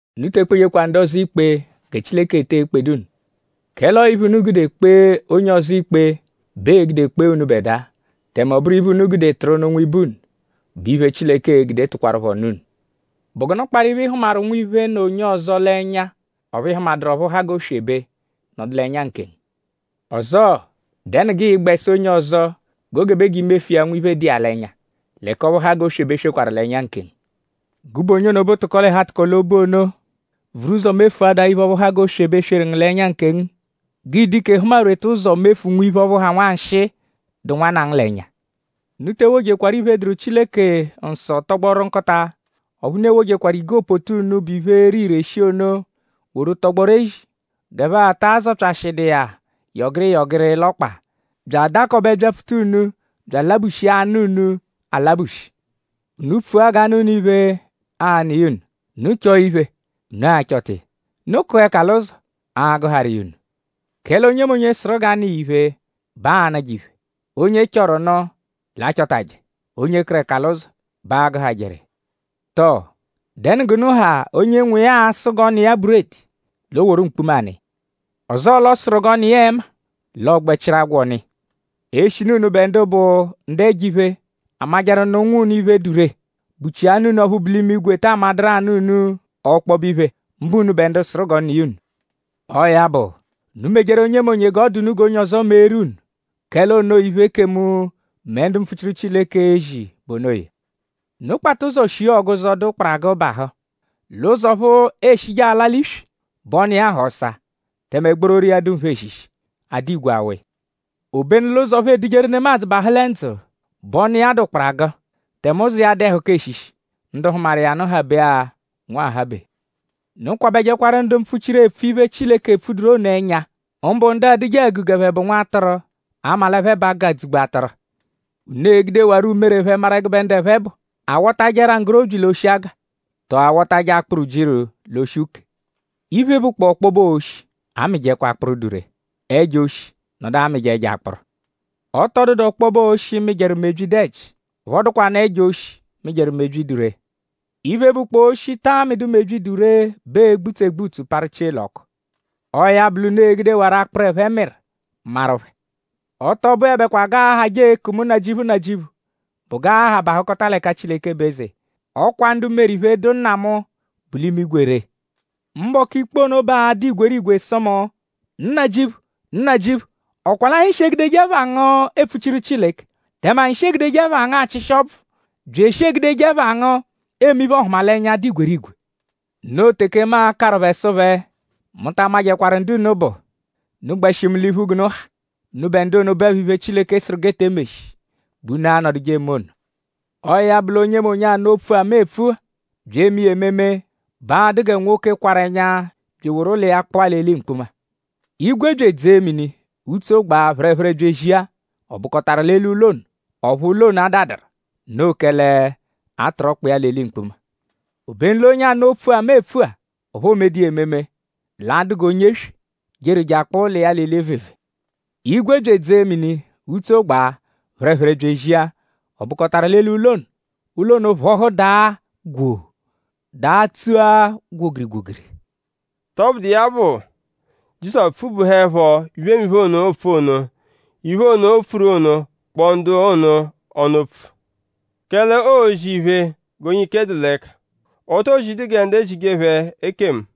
“Unu te ekpejekwa ndu ọzo ikpe gẹ Chileke etee kpedu unu. Kẹle ọo iphe, unu gude kpee onye ọzo ikpe bẹ ee-gude kpee unubẹdua. Tẹme ọ bụru iphe, unu gude tụru nụ nwibe unu bụ iphe, Chileke e-gude tụkwarupho nụ unu. ?Bụ gụnu kparụ iphe, ị hụmaru nwiphe, nọ onye ọzo l'ẹnya; ọphu ị hụmaduru ọphu ha g'oswebe nọdu ngu l'ẹnya nkengu? Ọzoo;?dẹnu g'ịi-gbẹ sụ onye ọzo g'o gebe g'i mefu iya nwiphe, dụ iya l'ẹnya; l'ẹka ọphu ha g'oswebe swekwaru l'ẹnya nkengu? Gụbe onye ono bụ tụko-l'ẹhu-atụko-l'obu ono! Vuru ụzo mefuadaa iphe ọphu ha g'oswebe, sweru ngu l'ẹnya nkengu; g'ịi-dụ ike hụma-rweta ụzo mefu nwiphe ọphu ha nwanshịi, dụ nwanna ngu l'ẹnya. “Unu te ewojekwaru iphe, dụru Chileke nsọ tọgboru nkụta; ọphu unu ewojekwaru igopoto unu, bụ iphe, ere ire shii ono woru tọgboru ezi; g'ẹphe ataa zọpyashidu iya yọgiri yọgiri l'ọkpa; bya adakọbe byapfuta unu; bya alabushia anụ unu alabushi.” “Unu pfua g'a nụ unu iphe; aa-nụ iya unu! Unu chọo iphe; unu a-chọta iya! Unu kụa ẹka l'ụzo; aa-gụharu iya unu. Kẹle onyemonye, sụru g'a nụ iya iphe bẹ aanụje iphe; onye chọru nụ l'achọtaje; onye kụru ẹka l'ụzo bẹ aagụhajeru iya. Tọo?dẹnu g'unu ha, onye nwa iya a-sụ g'ọ nụ iya buredi; l'o woru mkpuma nụ iya? Ọzoo l'ọ sụru g'a nụ iya ẹma; l'ọ gbẹ chịru agwọ nụ iya. Eshinu unubẹ ndu bụ ndu ẹjo-iphe amajẹru nụ ụnwu unu iphe, dụ ree;?bụchia Nna unu ọphu bu l'imigwe taa madụru anụ unu ọkpobe iphe; mbụ unubẹ ndu sụru g'ọ nụ iya unu? “Ọo ya bụ; unu mejeru onyemonye g'ọ dụ unu g'onye ọzo meeru unu. Kẹle onoo iphe, ekemu mẹ ndu mpfuchiru Chileke ezi bụ onoya.” “Unu kpata ụzo shia ọguzo, dụ kparagụ bahụ. L'ụzo ọphu eeshije ala l'iswi bẹ ọnu iya ha ọsa; tẹme gbororo iya dụ nphe eshishi; a dụ igwe awụ iya. Obenu l'ụzo ọphu edujeru nemadzụ bahụ lẹ ndzụ; bẹ ọnu iya dụ kparagụ; tẹme ụzo iya dụ ẹhuka eshishi; ndu hụmaru iya nụ habe-a nwahabe.” “Unu kwabẹjekwaru ndu mpfuchiru, epfu iphe, Chileke epfuduru ono ẹnya. Mbụ ndu adụje àgù g'ẹphe bụ nwatụru; 'a ma l'ẹphe bụ agụ, adzụ-gbu atụru. Unu e-gudewarọ umere phẹ maru ẹgube ndu ẹphe bụ.?A wọtaje ẹra nggorobyi l'oshi aga? Tọ?a wọtaje akpụru ujiru l'oshi úkèè? Iphe, bụkpoo ọkpobe oshi amịjekwa akpụru, dụ ree. Ẹjo oshi nọdu amịje ẹjo akpụru. Ọ tọ dụdu ọkpobe oshi, mịjeru mebyi, dụ ẹji; ọphu ọ dụkwanu ẹjo oshi, mịjeru mebyi, dụ ree. Iphe, bụkpoo oshi, taa mịdu mebyi, dụ ree bẹ ee-gbutsu egbutsu parụ chie l'ọku. Ọo ya bụ l'unu e-gudewarọ akpụru, ẹphe mịru; maru phẹ.” “Ọ tọ bụebekwa g'aahajẹ eeku mu ‘Nnajịuphu; Nnajịuphu’; bụ g'aa-ha bahụkota l'ẹka Chileke bụ eze. Ọ kwa ndu meru iphe, dụ Nna mu, bu l'imigwe ree. Mbọku ikpe ono bẹ aa-dụ igwerigwe sụ mu: ‘Nnajịuphu! Nnajịuphu!?Ọ kwa l'anyi shi egudeje ẹpha ngu epfuchiru Chileke; tẹme anyi shi egudeje ẹpha ngu achịshi ọbvu; bya eshi egudeje ẹpha ngu eme iphe-ọhumalenya, dụ igwerigwe.’ Noo teke mu a-karụ phẹ sụ phẹ: ‘Mu ta amajẹkwaru ndu unu bụ. Unu gbẹshi mu l'iphu g'unu ha; unubẹ ndu ono, bụepho iphe, Chileke sụru g'e te emeshi bẹ unu anọduje eme ono.’” “Ọo ya bụ l'onyemonye, anụ opfu-a, mu epfu-a bya eme iya ememe bẹ a-dụ gẹ nwoke, kwarụ ẹnya bya eworu ụlo iya kpụa l'eli mkpuma. Igwe bya edzee mini; utso gbaa; phẹrephere bya ezia; ọ bụkotaru l'eli ụlo ono; ọphu ụlo ono adadụru; noo kẹle a tụru ọkpa iya l'eli mkpuma. “Obenu onye anụ opfu-a, mu epfu-a; ọphu oomedu iya ememe l'a-dụ g'onye eswe, jeru je akpụa ụlo iya l'eli evevee. Igwe bya edzee mini; utso gbaa; phẹrephere bya ezia; ọ bụkotaru l'eli ụlo ono. Ụlo ono phọhu daa gwoo; daa tsua gwogiri-gwogiri.” Tọbudu iya bụ; Jizọsu pfubuhuẹpho iphemiphe ono, oopfu ono; iphe ono, o pfuru ono kpọo ndu ono ọnu opfu. Kẹle oozi iphe g'onye ike dụ l'ẹka. O too zidu gẹ ndu ezije phẹ ekemu.